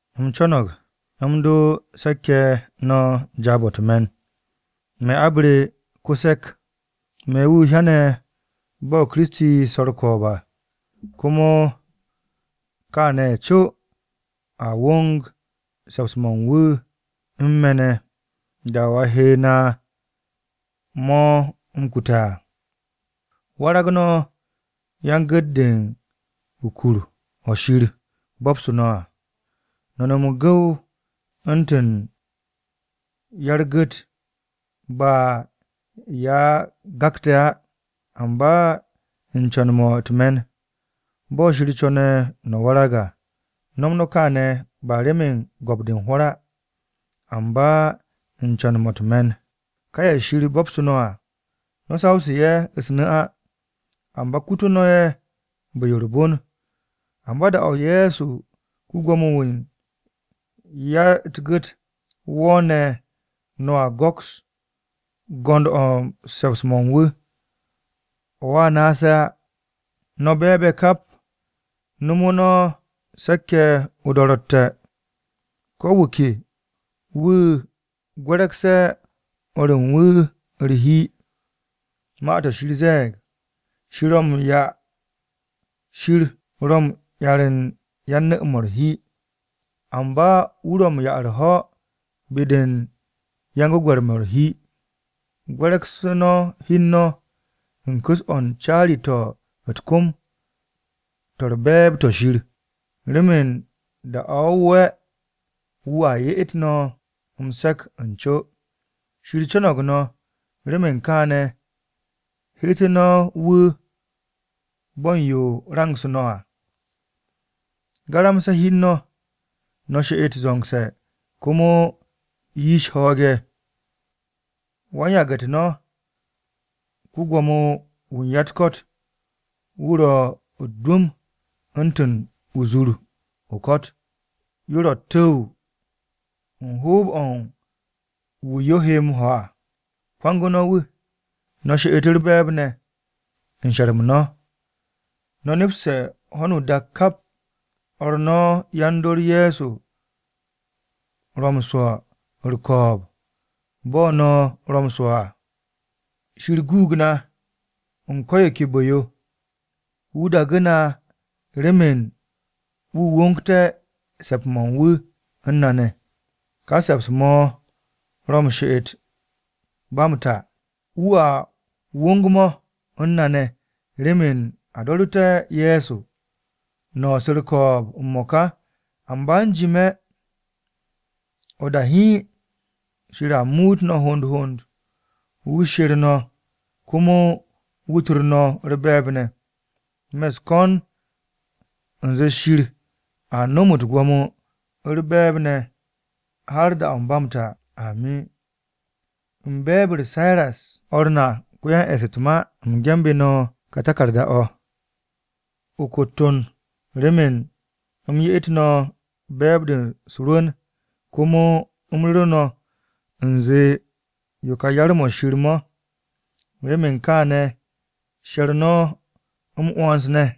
U̱m co̱no̱g m-do se̱k-ye̱ no̱ jaab-o̱ u̱t-me̱n. Me̱ abre ko-se̱k, me̱ wu̱ hyane̱ bo̱ Kiristi swo̱ u̱r-ko̱o̱b à. Komo kane̱ co a wong se̱ps-mo̱ u̱n wu̱ u̱n me̱ ne̱ da-o̱ a he na mo̱ m-kute̱ à. Warag no̱ yan-gu̱t-de u̱n kur-o̱ Shir bo̱bsu̱ no̱ à. No̱ nom m-gu̱w u̱ntu̱n ya-u̱r-gu̱t ba ye̱ a gakte̱ á, amba u̱n co̱n-mo̱ u̱t-me̱n, bo̱ Shir co̱ne̱ no̱ warag à. No̱m no̱ kaane̱ ba remen go̱p-de u̱n hwo̱r á amba u̱n co̱n-mo̱ u̱t-me̱n. Ka ye̱ Shir bo̱bsu̱ no̱ à, no̱ sawsu̱ ye̱ u̱s-nu̱ á, amba kute̱ no̱ ye̱ bu̱-yo u̱r-bon. Amba da-o̱ Ye̱so ko-Gwo̱mo-wu̱ u̱n ya-u̱t-Gu̱t wo̱o̱ne̱ no̱a go̱ks go̱nd-o̱ u̱n se̱ps-mo̱ u̱n wu̱, o̱a naase̱ á. No̱ be̱e̱b-ye̱ kap, nomo no̱ se̱k-ye̱ o-do̱ro̱tte̱. Ko̱ wu̱ ke wu̱ gwe̱re̱gse̱ o̱r u̱n wu̱ u̱r-hi. Ma-to̱ Shir ze̱e̱g, “Shir ro̱ m-'yar u̱n yan-nu̱-mo̱ u̱r-hi, amba wu̱ ro̱ u̱n 'ya u̱r-ho̱ be-de yan-gwe̱gwe̱r-mo̱ u̱r-hi.” Gwe̱re̱gse̱ no̱ hi u̱n no̱ u̱n ku̱s-o̱ u̱n caari-to̱ u̱t-kom to̱ u̱r-be̱e̱b to̱ Shir, remen da-o wo̱ wo'e̱ wu̱a 'ye no̱ m-se̱k u̱n co. Shir co̱no̱g no̱, remen kaane̱, heetu̱ no̱ wu̱ bo̱ u̱n yo rangsu̱ no̱ à. Garamse̱ hi u̱n no̱, no̱ she'et zo̱ngse̱ komo yish ho̱o̱g-ye̱. Wan-yage̱-u̱t no̱, ko-Gwo̱mo-wu̱ u̱n ya-u̱t-ko̱t, wu̱ ro̱ u̱t-dwu̱m u̱ntu̱n o-zur o-ko̱t, yo ro̱ u̱t-tu̱w u̱n hoob-o̱ u̱n wu̱ yo he m-ho̱ à. Kwangu̱ no̱ wu̱, no̱ she'et u̱r-be̱e̱b ne̱ u̱n she̱r-m no̱. No̱ nepste̱ ho̱no o-dak kap o̱r no̱ ne̱ yan-dor Ye̱so ro̱ m-swo̱ u̱r-ko̱o̱b bo̱ no̱ ro̱ m-swo̱ à. Shir guug na u̱n ko̱ yo ke bu̱-yo. Wu̱ daagu̱ na remen wu̱ wongté̱ se̱ps-mo̱ u̱n wu̱ u̱n na ne̱. Ka se̱ps-mo̱ ro̱ m-she'et ba m-ta. Wu̱a wong-mo̱ u̱n na ne̱ remen a do̱ru̱te̱ Ye̱so Kiristi. No̱ su̱ u̱r-ko̱o̱b m-mo̱ka, amba u̱jime̱ o-da hiin, Shir a muut no̱ hond hond, wu̱ she̱r no̱ komo wu̱ tor no̱ u̱r-be̱e̱b ne̱. Me̱ u̱s-ko̱n u̱nze Shir a nom u̱t-gwo̱mo u̱r-be̱e̱b ne̱ har da-o̱ ba m-ta. Amin. U̱n be̱e̱b-u̱r Siras o̱r na ko-yan-e̱ss u̱t-ma à, u̱m ge̱nbe̱ no̱ ka taku̱rda-o̱ o-kotton remen u̱m ye'et no̱ be̱e̱b-de u̱s-rwu̱n komo u̱m ru̱ru̱ no̱, u̱nze yo ka yar-mo̱ Shir mo̱. Remen kaane̱ she̱r no̱ m-'wo̱ns ne̱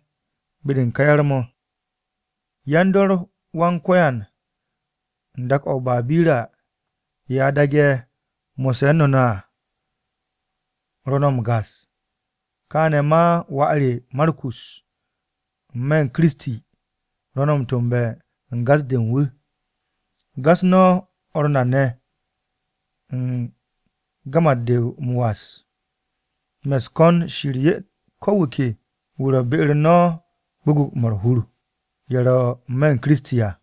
be-de u̱n ká yar-mo̱. Yan-dor Wan-Ko̱yan u̱n dak-o̱ o-Babira ye̱ a daage̱ mo̱sse̱ u̱n no̱ ne̱ à ro̱ no̱ m-gas. Kaane̱ ma wà re Markus n-me̱ u̱n Kiristi, ro̱ no̱ m-to̱mbe̱ u̱n gas-de u̱n wu̱. Gas no̱ o̱r na ne̱ u̱n gamat-de m-was. Me̱ u̱s-ko̱n Shir 'ye ko wu̱ ke wu̱ ro̱ be-u̱r no̱ à gwu̱gwu̱-mo̱ u̱r-hur, ye̱ ro̱ n-me̱ u̱n Kiristi à.